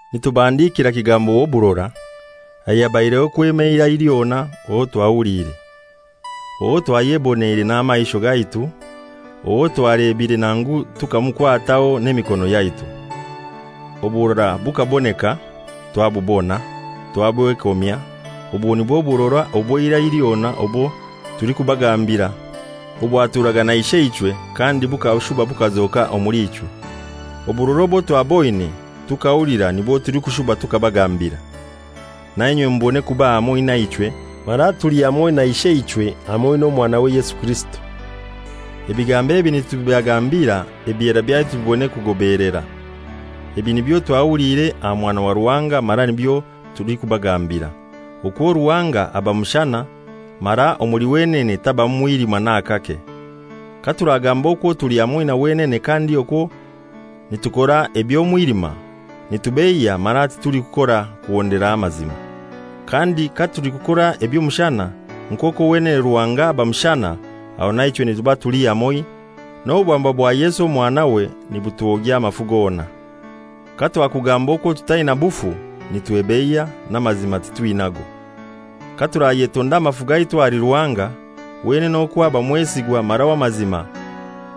Nitubahandikira Kigambo w'oburora, ayabaireho kwema eirai lyona owo twahuliire, owo twayeboneire n'amaisho gaitu, owo twalebire nangu tukamukwataho n'emikono yaitu. Oburora bukaboneka, twabubona, twabwekomya, obwo nibwo burora obw'eira lyona obwo tulikubagambira, obwaturaga na Isheichwe kandi bukashuba bukazoka omuli ichwe. Oburora obwo twaboine tukahulira nibwo tulikushuba tukabagambira, nainywe mubone kuba hamoi naichwe; mara tuli hamoi na Isheichwe hamoi n'Omwanawe Yesu Kirisito. Ebigambo ebi nitubibagambira ebyera byaitu bibone kugobeelera. Ebi nibyo twahuliire aha Mwana wa Ruhanga mara nibyo tulikubagambira, okwo Ruhanga aba mushana mara omuli wenene tabamu mwilima n'akake. Katuragamba okwo tuli hamoi na wenene kandi okwo nitukora eby'omwilima, nitubeiya mara titulikurora kuhondera amazima. Kandi katulikukora eby'omushana, nk'okwo wenene Ruhanga aba mushana, aho naichwe nituba tuli hamoi, n'obwamba bwa Yesu Omwanawe nibutwogya amafu gona. Katwakugamba okwo tutaina bufu, nitwebeiya, n'amazima titwinago. Katurayetonda amafu gaitu ahali Ruhanga, wenene okwo aba mwesigwa mara w'amazima,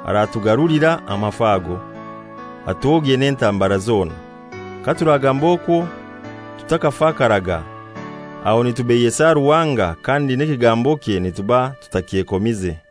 aratugarulira amafu ago, atwogye n'entambara zona. Katuragamba okwo tutakafakaraga, aho nitubeiyesa Ruhanga kandi n'ekigambokye nituba tutakyekomize.